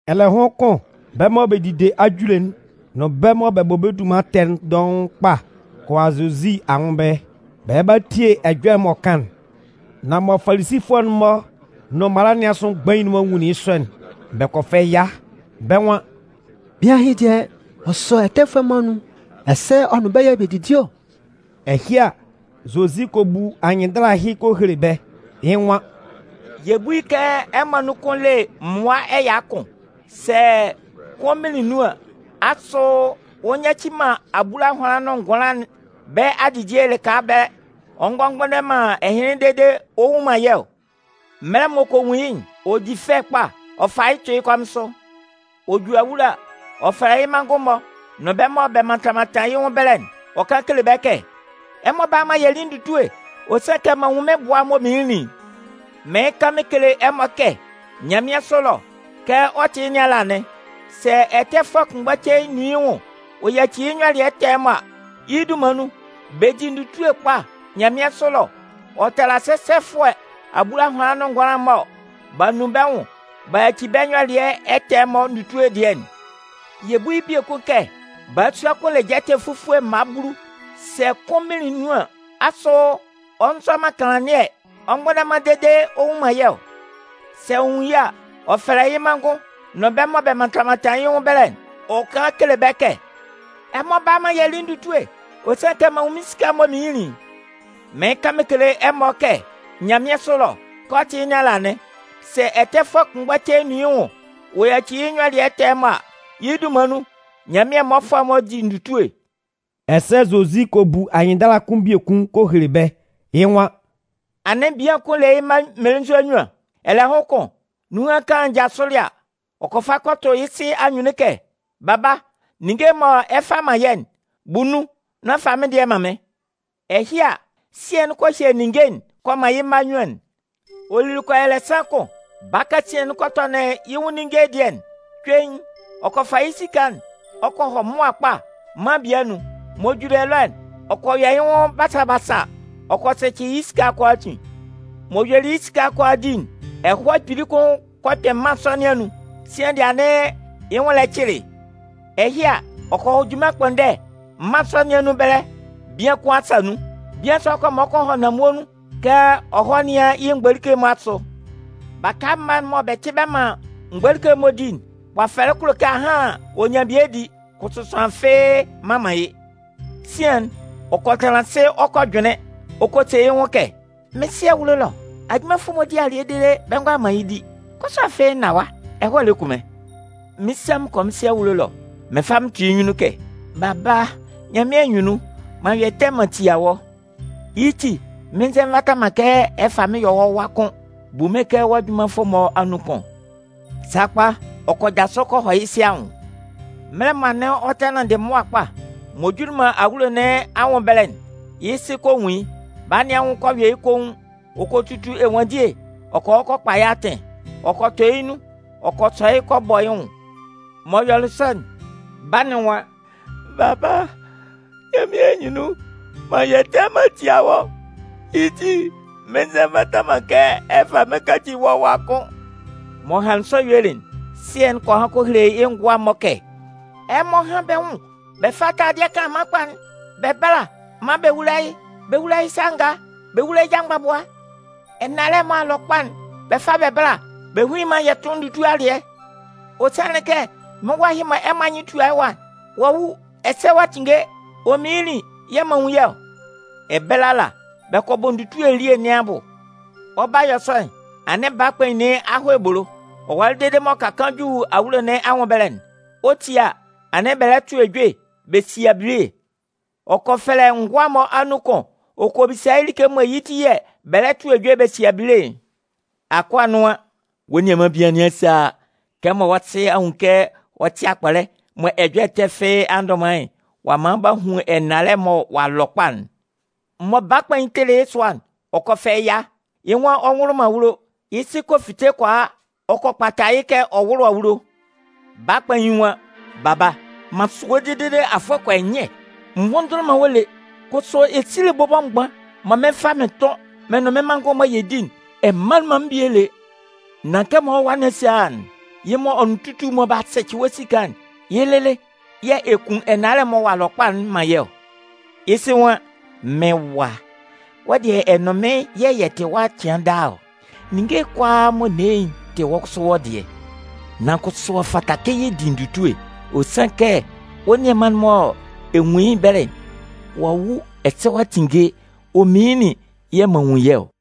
Ɛlɛhʋn kʋn, bɛ́ mɔ bɛ dide ajule'n nʋn bɛ́ mɔ bɛ bɔ bɛ́ dunman ɛtɛ'n dɔʋn kpa kɔ a Zozi anwʋn ɛbɛlɛ. Bɛ lɛ ba tie ɛjɔlɛ'n m'ɔ kan'n. Nan mɔ Falisifʋɛ'n-mɔ nʋn mala nɩn asʋ mgbain'n-mɔ nwunlin yɩ́ sɔ'n, bɛ kɔ fɛ ɛya. Bɛ́ nwan: “Bian ɛhɩ dɩɛ, ɔ sɔ ɛtɛfʋɛ'n-mɔ anun, ɛsɛ ɔ nʋn bɛ́ yɛ̂ bɛ didi ɔ!” Ɛhɩ a, Zozi kɔ bu anyɩnndala ɛhɩ ɔ kɔ hele bɛ́. Yɩ́ nwan: “Yɛ bú yɩ́ kɛ ɛmɔ anun kʋn le mmʋa ɛya kʋn. Sɛ kʋn minlin nun an, asʋ ɔ nyaci man abulahʋanlan nʋn ngʋanlan'n bɛ́ adidie lɩka ɛbɛlɛ, ɔ ngɔ mgbʋnndɛ man ɛhɩnlɩn dede ɔ nnwun man yɩ́ ɔ? Mɛlɛ m'ɔ kɔ nwun yɩ́'n, ɔ di fɛ kpa ɔ fa yɩ́ tʋ yɩ́ kɔmɩn sʋ. Ɔ ju awulo a, ɔ fɛfɛlɛ yɩ́ manngʋn-mɔ nʋn bɛ́ mɔ bɛ mantan mantan yɩ́ nwʋn ɛbɛlɛ'n, ɔ kan kele bɛ́ kɛ: ‘Ɛmɔ bála maan yɛ lí ndutue. Ɔ sanlɩn kɛ m'an nwun mɩ́n bʋa'n m'ɔ minlinlin'n!’ Mɩɩn kan mɩn kele ɛmɔ kɛ nyanmɩansʋ ɛlɔ, kɛ ɔ tɩ yɩ́ nɩn ala anɩn. Sɛ ɛtɛfʋɛ kʋnmgba cein nun yɩ́ nwʋn ɔ yaci yɩ́ nyɔlɩɛ ɛtɛ'n-mɔ a, yɩ́ dunman nun, bɛ di ndutue kpili kpa nyanmɩansʋ ɛlɔ ɔ tala sɛsɛfʋɛ abulahʋanlan nʋn ngʋanlan mɔ b'a nun bɛ́ nwʋn b'a yaci bɛ́ nyɔlɩɛ ɛtɛ'n-mɔ ndutue dɩɛ'n. “Yɛ bú yɩ́ biekun kɛ balasua kʋn le jɛtɛ fufue mma bulu. Sɛ kʋn minlin nun an, asʋ ɔ nzɔ man kanlannɩɛ ɔ mgbʋnndɛ man dede ɔ nnwun man yɩ́ ɔ? Sɛ ɔ nwun yɩ́ a, ɔ fɛfɛlɛ yɩ́ manngʋn-mɔ nʋn bɛ́ mɔ bɛ mantan mantan yɩ́ nwʋn ɛbɛlɛ'n, ɔ kan kele bɛ́ kɛ: ‘Ɛmɔ bála maan yɛ lí ndutue. Ɔ sanlɩn kɛ m'an nwun mɩ́n esika'n m'ɔ minlinlin'n!’ Mɩɩn kan mɩn kele ɛmɔ kɛ nyanmɩansʋ ɛlɔ, kɛ ɔ tɩ yɩ́ nɩn ala anɩn. Sɛ ɛtɛfʋɛ kʋnmgba cein nun yɩ́ nwʋn ɔ yaci yɩ́ nyɔlɩɛ ɛtɛ'n-mɔ a, yɩ́ dunman nun, Nyanmɩan mmɔfʋɛ'n-mɔ di ndutue.” Ɛsɛ Zozi kɔ bu anyɩnndala kʋn biekun kɔ hele bɛ́. Yɩ́ nwan: “Anɩn bian kʋn le yɩ́ mma mmelenzua nnyuan. Ɛlɛhʋn kʋn, nunhan kaan'n jasʋlɩ a, ɔ kɔ fa kɔ tʋ yɩ́ sɩ anyunnun kɛ: ‘Baba, ninnge'n mɔ ɛ 'fa man yɛ́'n, bu nun nán fa mɩ́n dɩɛ man mɩ́n.’ Ɛhɩ a, sɩɛ'n kɔ hye ninnge'n ɔ kɔ man yɩ́ mma nnyuan'n. “Ɔ lili kɔ yɔ ɛlɛsan kʋn, baa kasian kɔ tɔnɩn yɩ́ nwʋn ninnge dɩɛ'n. Cuein, ɔ kɔ fa yɩ́ esika'n ɔ kɔ hɔ mʋa kpa mân bie anun. M'ɔ juli ɛlɔ'n, ɔ kɔ yɔ yɩ́ nwʋn basa basa ɔ kɔ sɛcɩ yɩ́ esika'n kʋalaatin. M'ɔ yuelɩ yɩ́ esika'n kʋalaa di'n, ɛhɔɛ kpili kʋn kɔ kpɩn mân sɔ nɩn anun. Sian dɩɛ anɩn yɩ́ nwʋn lɛ cɩlɩ yɩ́. Ɛhɩ a, ɔ kɔ hɔ junman ɛkpʋnndɛ mân sɔ nɩn anun ɛbɛlɛ bian kʋn asa nun. Bian sɔ'n kɔ man ɔ kɔ hɔ nanmue nun kɛ ɔ hɔ́ nɩ́an yɩ́ mgbolike'n-mɔ asʋ. Baka mma'n mɔ bɛ tɩ bɛ man mgbolike'n-mɔ di'n, kpafɛlɛ'n kulo kɛ ahan ɔ nyan bie di. Kʋsʋ sʋanlan fɩ́ɩ́ mman man yɩ́. “Sian'n, ɔ kɔ tanlan asɩ ɔ kɔ jʋnlɩn. Ɔ kɔ se yɩ́ nwʋn kɛ: ‘Mɩ́n sɩ ɛlɔ ajunmanfʋ'n-mɔ di alɩɛ dede bɛ ngʋala man yɩ́ di. Kʋsʋ afɩ n na ɛwa, ɛhɔɛ lɛ kun mɩ́n! Mɩn 'sa mɩn kɔ mɩ́n sɩ anwʋn ɛlɔ, mɩn 'fa mɩn tʋ yɩ́ nyunnun kɛ: Baba, Nyanmɩan anyunnun, m'an yɔ ɛtɛ m'an tia wɔ́. Yɩ́ ti, mɩn nzɛ nvata man kɛ ɛ fá mɩ́n ɛ yɔ́ wɔ́ wa kʋ́n. Bu mɩ́n kɛ wɔ́ ajunmanfʋ'n-mɔ anun kʋn.’ Sakpa, ɔ kɔ jasʋ kɔ hɔ yɩ́ sɩ anwʋn. “Mɛlɛ mɔ anɩn ɔ tɛ nanndɩ mʋa kpa, m'ɔ juli man awulo nɩn anwʋn ɛbɛlɛ'n, yɩ́ sɩ kɔ nwun yɩ́. Baa nɩn anwʋn kɔ yɔ yɩ́ koun. Ɔ kɔ tutu ɛnwanndie ɔ kɔ hɔ kɔ kpa yɩ́ atɩn, ɔ kɔ tɔ yɩ́ nun ɔ kɔ sɔ yɩ́ ɔ kɔ bɔ yɩ́ nwʋn. “M'ɔ yɔlɩ sɔ'n, baa'n nwan: ‘Baba, Nyanmɩan anyunnun, m'an yɔ ɛtɛ m'an tia wɔ́. Yɩ́ ti, mɩn nzɛ nvata man kɛ ɛ fá mɩ́n ɛ káci wɔ́ wa kʋ́n.’ “M'ɔ hanlɩn sɔ yuelɩ'n, sɩɛ'n kɔ han kɔ hele yɩ́ ngʋa'n-mɔ kɛ: ‘Ɛmɔ hán bɛ́ nwʋn bɛ fá taladɩɛ kanlanman kpa'n bɛ bála maan bɛ wúla yɩ́. Bɛ wúla yɩ́ sa ngaa, bɛ wówula yɩ́ ja mgbabʋa. Ɛnalɛ'n mɔ ɔ'a lɔ kpa'n, bɛ fá bɛ bála, bɛ hún yɩ́ maan yɛ tʋ́n ndutue alɩɛ. Ɔ sanlɩn kɛ mɩ́n wa ɛhɩ mɔ ɛmɔ anyɩn tua yɩ́ ɛwa'n, ɔ a wu ɛsɛ ɔ'a tinnge, ɔ minlinlin yɛ̂ m'an nwun yɩ́ ɔ.’ Ɛbɛlɛ ala, bɛ kɔ bɔ ndutue elie nɩn abʋ. “Ɔ 'ba yɔ sɔ'n, anɩn baa kpain nɩn a hɔ ebolo. Ɔ walɩ dede m'ɔ ka kaan ju awulo nɩn anwʋn ɛbɛlɛ'n, ɔ 'tie a, anɩn bɛ lɛ tʋ ejue bɛ si abile. Ɔ kɔ fɛlɛ ngʋa'n-mɔ anun kʋn ɔ bisa yɩ́ like mɔ yɩ́ ti yɛ̂ bɛ lɛ tʋ ejue bɛ si abile'n. Akʋa'n nwan: ‘Wɔ́ nianman bian nɩn a sa a a. Kɛmɔ wɔ́ sɩ a nwun kɛ ɔ tɩ akpɔlɛ mɔ ɛjɔlɛ ɛtɛ fɩ́ɩ́ a ndʋ man yɩ́'n, ɔ a man b'a hun ɛnalɛ'n mɔ ɔ'a lɔ kpa'n.’ “Mɔ baa kpain'n tɩlɩ yɩ́ sʋa'n ɔ kɔ fɛ ɛya. Yɩ́ nwan ɔ nwʋlʋ man awulo. Yɩ́ sɩ kɔ fite kɔ a, ɔ kɔ kpata yɩ́ kɛ ɔ wʋ́lʋ awulo. Baa kpain'n nwan: ‘Baba, m'an sʋ wɔ́ dede afʋɛ kɔ yɔ nyɛ, n nvʋnndʋnlʋn man wɔ́ lé. Kʋsʋ, esile bɔbɔ mgban mɔ mɩn 'fa mɩn tʋn mɩ́n nʋn mɩ́n manngʋn'n-mɔ yɛ di'n, ɛ manlɩn man mɩ́n bie lé. Nan kɛmɔ wɔ́ wa nɩn a sa a a'n, yɩ́ mɔ ɔ nʋn tutu'n-mɔ b'a li wɔ́ esika'n, yɩ́ lɩlɩ yɛ̂ ɛ kun ɛnalɛ'n mɔ ɔ'a lɔ kpa'n man yɩ́ ɔ!’ “Yɩ́ sɩ nwan: ‘Mɩ́n wa, wɔ́ dɩɛ ɛ nʋn mɩ́n yɛ̂ yɛ tɩ ɛwa cɩan daa ɔ. Ninnge kʋalaa mɔ n ne yɩ́'n tɩ wɔ́ kʋsʋ wɔ́ dɩɛ. Nan kʋsʋ, ɔ fata kɛ yɛ di ndutue. Ɔ sanlɩn kɛ wɔ́ nianman'n mɔ ɛ nwun yɩ́ ɛbɛlɛ'n, ɔ'a wu ɛsɛ ɔ'a tinnge, ɔ minlinlin yɛ̂ m'an nwun yɩ́ ɔ!’”